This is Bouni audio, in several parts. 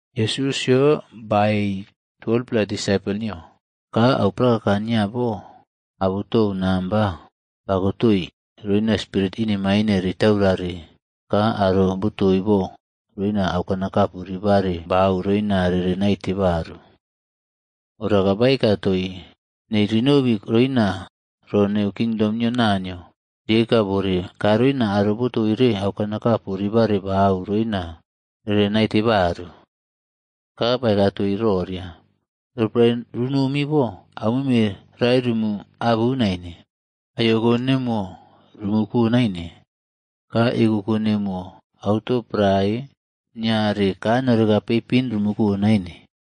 Yesusꞌyo baei 12-pla disaipol nio, ka auprakaka nio boabutou namba bakotoi roina spirit inemaine ritaurare ka aro botoi bo roina aukanakapu ribare bau roina rere naite baru. Ora ka baeka toii nei rinobi roina ro neu kingdom nio Naniyoa rieka bore ka roina aro botoire aukanakapu ribare bau roina rere naite baru. Ka baeka toii roria, “Roporae runomi bo, aumeme rae rumu abu naine. Aiyoko nemuwo rumu ko naine, ka ekoko nemuwo, auto prae, niare, ka noreka peipin rumu ko naine.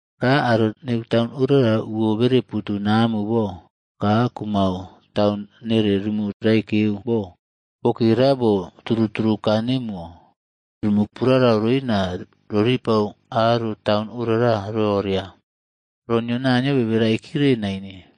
Ka aro neu taun orara uwo bere putu namu bo ka kumau taun nere rumu raikeu bo. Bokera bo turu turu kaa nemuwo, rumu purarau roina roripare aro taun orara roria, ro nio Naniyo bere raikire naine.b”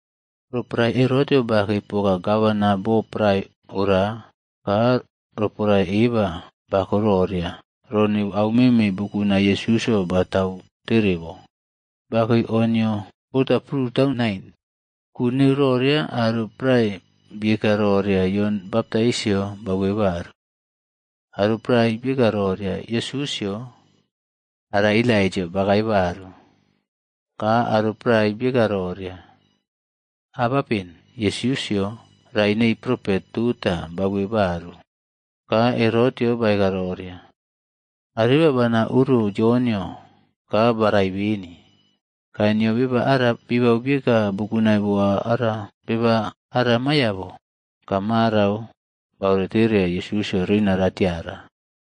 Roporae Herotꞌyo bakei poka gavana bo prae ora ka roporae eba bako roria ro neu au meme bukunai Yesusꞌyo batau tere bo, bakei o nio bota prutau nain. Ku neu roria aro prae bieka roria Jon Baptaisꞌyo, bauwe baru. Aro prae bieka roria Yesusꞌyo ara Elaijaꞌo bakae baru. Ka aro prae bieka roria, “Abapen Yesusꞌyo rae nei propet tota bauwe baru.” Ka Herot baeka roria, “Areba bana oro Yonꞌyo ka barai beni, ka nio beba ara bibau bieka bukunai boa ara, beba ara maiya bo?” Ka marau baore tereya Yesusꞌyo roina ratiara.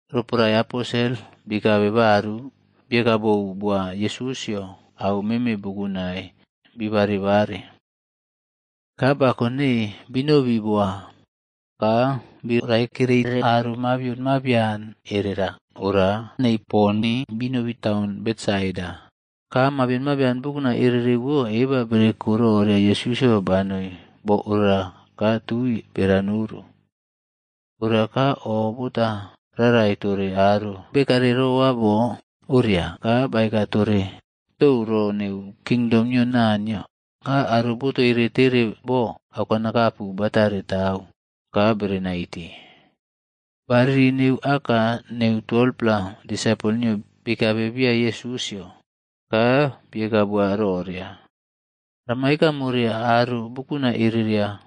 Roporae Aposel bikabe baru, bieka bou boa Yesusꞌyo au meme bukunai bi bareꞌbare. Ka ba konei binobi boa ka bi raekerere aro mabian mabion erera ora nei poni binobi taun Betsaida. Ka mabion mabian bukunai ererewo eba bereko roria Yesusꞌyo banoi bo orara ka tui bera noru. Ora ka o bota rarai tore aro bekare roa bo oria ka baeka tore tou ro neu kingdom nio Naniyo ka aro botoire tere bo aukanakapu batare tau ka bere naite. Bariri nau aka nei 12-pla disaipol nio bikabe bia Yesusꞌyo ka bieka boa roria, “Rama eka more aro bukunai ereria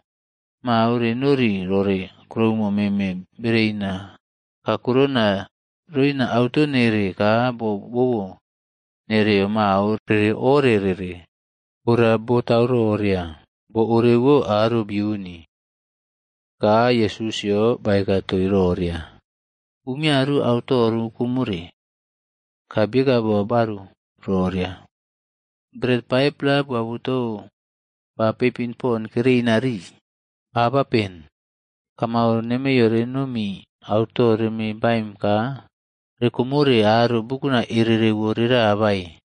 mao renori rore kuroumo meme bereina kakurona roina auto nere ka bo bobo nereo mao rere ore rere. Ora botau roria, bo orewo aro biuni.” Ka Yesusꞌyo baeka toii roria, “Umiaru auto rukomore.” Ka bieka boa baru roria, “Bret 5-pla boabutou ba peipin pon kereina rii. Abapen kamau nemeiyo renomi auto reme baim ka rekomore aro bukunai ererewo rera bae?”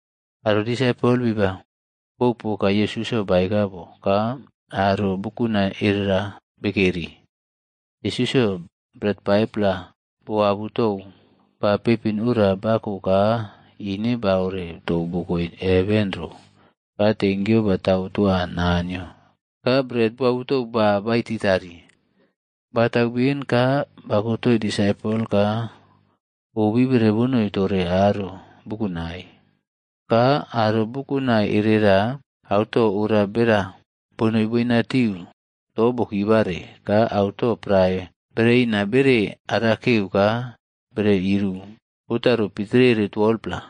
Aro disaipol bibau bou poka Yesusꞌyo baeka bo ka aro bukunai erera bekeri. Yesusꞌyo bret 5-pla boabutou ba peipin ora bako ka ine baore tou bokoe heven ro ka tenkyu batau toa Naniyo ka bret boabutou ba baititari. Batau ben ka bakotoi disaipol ka obibere bonoi tore aro bukunai. Ka aro bukunai erera auto ora bera bonoi boinatiu to bokibare ka auto prae bereina bere arakeu ka bere iru botaro pitrere 12-pla.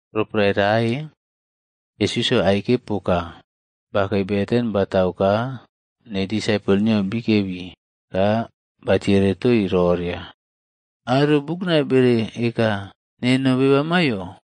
Roporae rae, Yesusꞌyo aike poka bakei beten batau ka nei disaipol nio bikebi ka batiere toii roria, “Aro bukunai bere eka nemo beba maiyo?”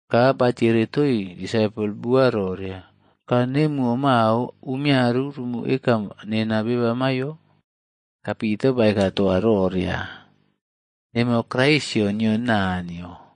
Ka batiere toii disaipol bua roria, “Ka nemuwo mao umiaru rumu eka nena beba maiyo?” Ka Pita baeka toa roria, “Nemo Kraisꞌyo nio Naniyo.”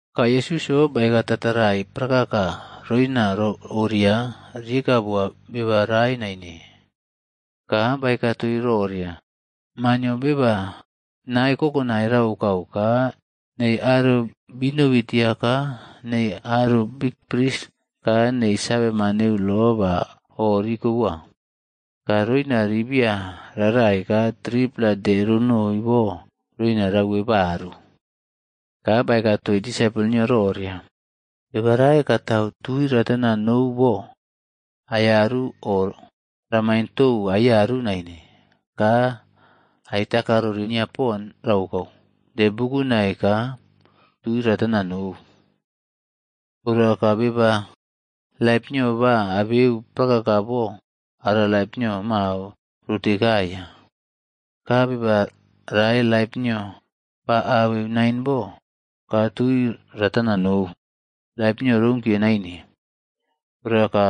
Ka Yesusꞌyo baeka tatarai prakaka roina ro oria rieka boa beba rae naine. Ka baeka toii roria, “Maa nio Beba nae kokonai raokau ka nei aro binobi tia ka nei aro bikpris ka nei saveman neu lo ba oreba rikoboa. Ka roina ribiya rarai ka 3-pla de ronoi bo roina ra uwe baru.” Ka baeka toii disaipol nio roria, “Beba rae katau tui ratana nou bo aiyaru o ramain tou aiyaru naine ka aitakarori nia pon raokaud de bukunai ka tui ratana nou. Ora ka beba laip nio ba abeu prakaka bo ara laip nio mao rotekaiya. Ka beba rae laip nio ba abeu nain bo ka tui ratana nou, laip nio rounkiye naine. Ora ka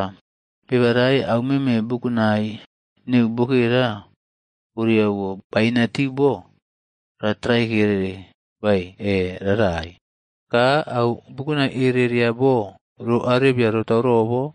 beba rae au meme bukunai neu bokera orewo bainatiu bo ratraikere bae e rarai, ka au bukunai ereꞌria bo ro arebia rotau robo?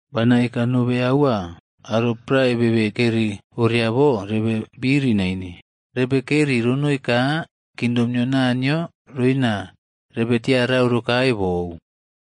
Bana eka nobe aua aro prae bebe keri oria bo rebe biri naine, rebe keri ronoi ka kingdom nio Naniyo roina rebe tiarau rokae bou.”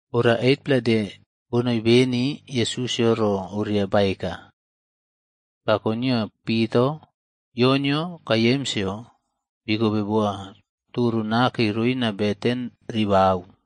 Ora 8-pla de bonoi beni Yesusꞌyo ro oria baeka, bako nio Pitaꞌo, Yonꞌyo ka Yemsꞌyo bikobe boa toro nake roina beten ribau.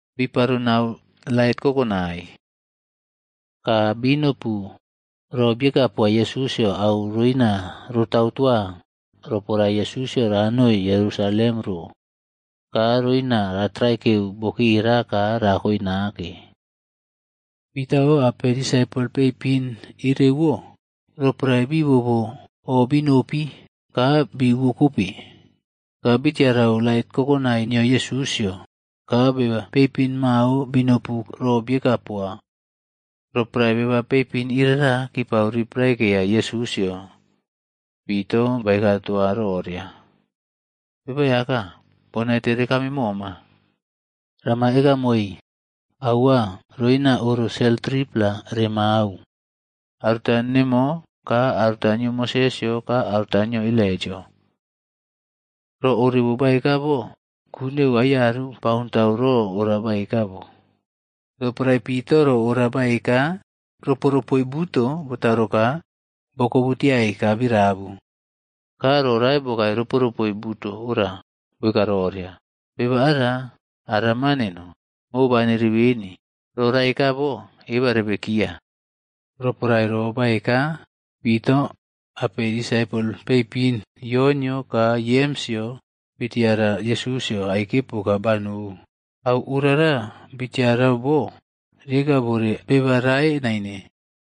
Biparo nau lait kokonai. Ka binopu ro bieka poa Yesusꞌyo au roina rotau toa roporae Yesusꞌyo ranoi Yerusalem ro ka roina ratraikeu bokera ka rakoe nake. Pitaꞌo apei disaipol peipin irewo, roporae bi bobo obinopi ka bi uwekobe, ka bitiarau lait kokonai nio Yesusꞌyo ka beba peipin mao binopu ro bieka poa. Roporae beba peipin irara kipau ri praikeya Yesusꞌyo, Pita baeka toa roria, “Beba Aiyaka, bonaite rekame moma. Rama eka moi aua roina oro sel 3-pla remau, aruta nemo, ka aruta nio Moses ka aruta nio Elaijaꞌo.” Ro orewo baeka bo ku neu aiyaru baontau ro ora baeka bo. Roporae Pita ro ora baeka, ropoꞌrope buto botaro ka bokobutiai ka birabu. Ka ro rae bokae ropoꞌrope buto ora boeka roria, “Beba ara, ara Maa neno, mobaneri beni. Ro raeka bo eba rebekiya.” Roporae ro baeka, Pitaꞌo apei disaipol peipin Yonꞌyo ka Yemsꞌyo bitiara Yesusꞌyo aike poka banou. Au orara bitiarau bo rieka bore beba rae naine.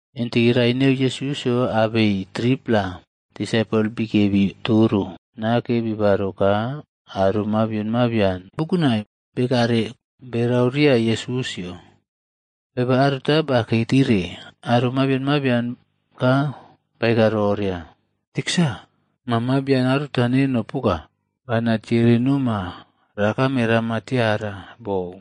Intiki rae neu Yesusꞌyo abei 3-pla disaipol bikebi toro nake bibaro ka aro mabion mabian bukunai bekare berau ria Yesusꞌyo. Beba aruta bakei tire aro mabion mabian ka baei roria “Tiksa, maa mabian aruta neno poka, bana tiere noma rakame rama tiara bou.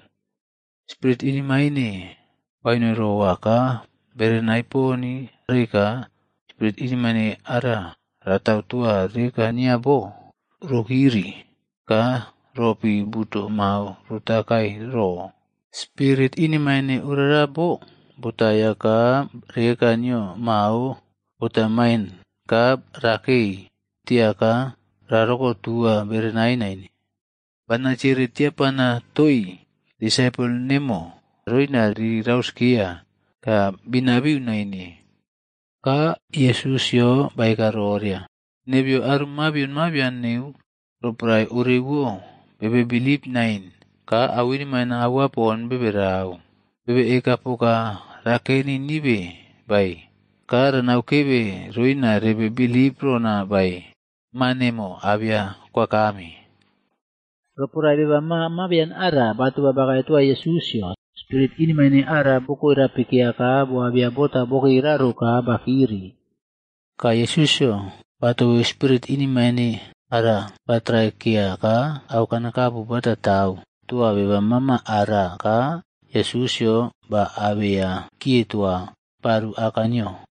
Spirit inemaine banoi rowa ka berenai poni rae ka spirit inemaine ara ratau toa reka nio bo, rokiri ka ropi buto mao rota kae ro. Spirit inemaine orara bo botaiya ka reka nio mao botamain ka rakei tia ka rarokotua berenai naine. Bana tiere tiapana toii disaipol nemo roina ri rauskeya, ka binabiu naine.” Ka Yesusꞌyo baeka roria, “Nebeyo aro mabion mabian neu roporae orewo bebe bilip naine ka au inemaine aua pon bebe rau. Bebe eka poka rakeni nibe bae ka ranaukebe roina rebe bilip rona bae? Maa nemo abeya kwakame.” Roporae beba maa mabian ara batoba bakae toa Yesusꞌyo, spirit inemaine ara bokoeꞌrapikeya ka boabeya bota bokera ro ka bakiri. Ka Yesusꞌyo batobeu spirit inemaine ara ba traikeya ka au kanakapu bata tau toa beba mama ara ka Yesusꞌyo ba abeya kie toa baru aka nio.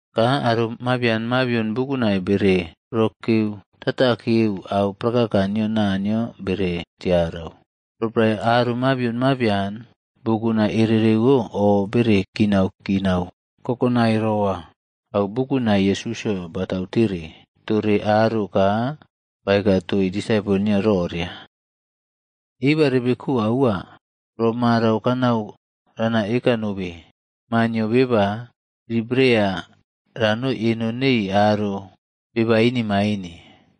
Ka aro mabian mabion bukunai bere rokeuꞌtatakeu au prakaka nio Naniyo bere tiarau. Roporae aro mabion mabian bukunai ererewo o bere kinaꞌkinau kokonai roa au bukunai Yesusꞌyo batautere tore aro ka baeka toii disaipol nio roria, “Eba rebeko aua ro marau kanau rana eka nobe. Maa nio Beba ribereya ranoi eno nei aro beba inemaine.”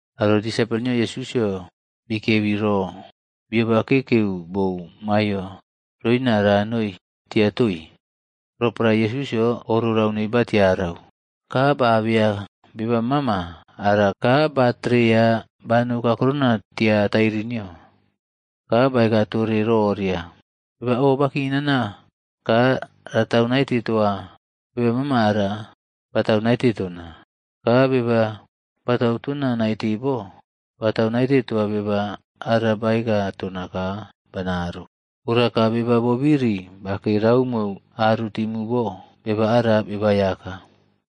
Aro disaipol nio Yesusꞌyo bikebi ro bioba kekeu bou maiyo roina ranoi tia toii. Roporae Yesusꞌyo o rorau nei batiarau, ka ba abeya beba mama ara ka batereya banou kaurona tia tairi nio. Ka baeka tore roria, “Beba o bakinaꞌna ka ratau naite toa beba mama ara, batau naite tona. Ka beba batau tona naite bo, batau naite toa beba ara baeka tona ka banaro. Ora ka beba bobiri bakei raumo aru timu bo, beba ara Beba Aiyaka.”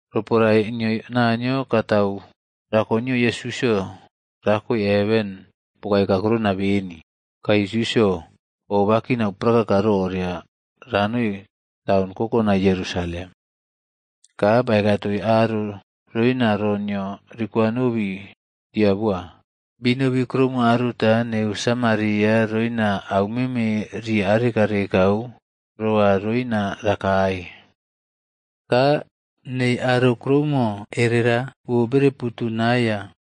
Roporae nio Naniyo katau rako nio Yesusꞌyo rakoe heven bokae kakurona beni, ka Yesusꞌyo o bakinau prakaka roria ranoi taun kokonai Yerusalem. Ka baeka toii aro roina ro nio rikwanobi tia boa. Binobi kuroumo aruta neu Samaria roina aumeme ri arekauꞌrekau roa roina rakae. Ka nei aro kuroumo erera uwo rere putu naiya,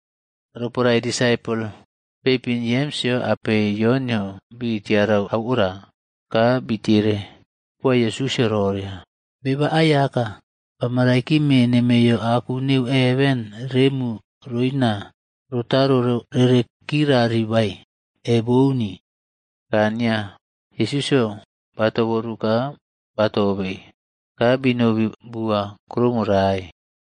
Roporae disaipol peipin Yemsꞌyo apei Yonꞌyo bi tiarau au ora, ka bitiere boa Yesusꞌyo roria, “Beba Aiyaka, bama raikime nemeiyo aku neu heven remu roina rotaro rere kirari bae, e bouni?” Ka nia Yesusꞌyo batoboru ka batobei, ka binobi bua kuroumo rae.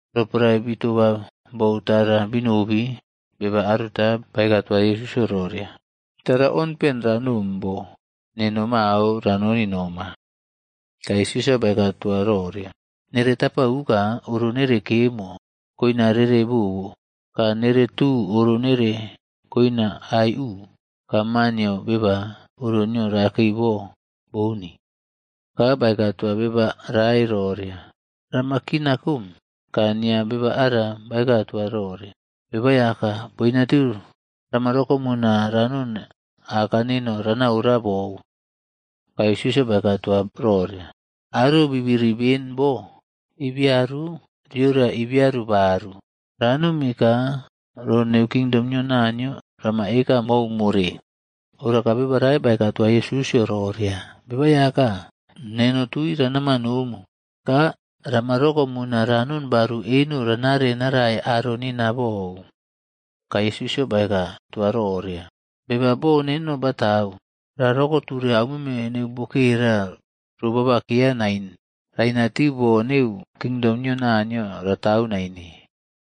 Roporae bitoba bou tara binobi, beba aruta baeka toa Yesusꞌyo roria, “Tara onpen ranom bo neno mao ranoni noma.” Ka Yesusꞌyo baeka toa roria, “Nere tapa uka oro nere kemo koina rere bobo ka nere tu oro nere koina aiꞌu, ka Maa nio Beba oro nio rakei bo bouni.” Ka baeka toa beba rae roria, “Rama kina kome.” Ka nia beba ara baeka toa roria, “Beba Aiyaka, boinatiu rama rokomuna ranoni aka neno ranaꞌora bou.” Ka Yesusꞌyo baeka toa roria, “Aro bibiri beni bo ibiaru riora ibiaru baru, ranomi ka ro neu kingdom nio Naniyo rama eka mou more.” Ora beba rae baeka toa Yesusꞌyo roria, “Beba Aiyaka, neno tui ranama nomu. Ka rama rokomuna ranon baru eno ranare narae aro neno bou.” Ka Yesusꞌyo baeka toa roria, “Beba bo neno batau, rarokoture aumeme neu bokera ro bobakeya nain, rainatiu bo neu kingdom nio Naniyog ratau naine.”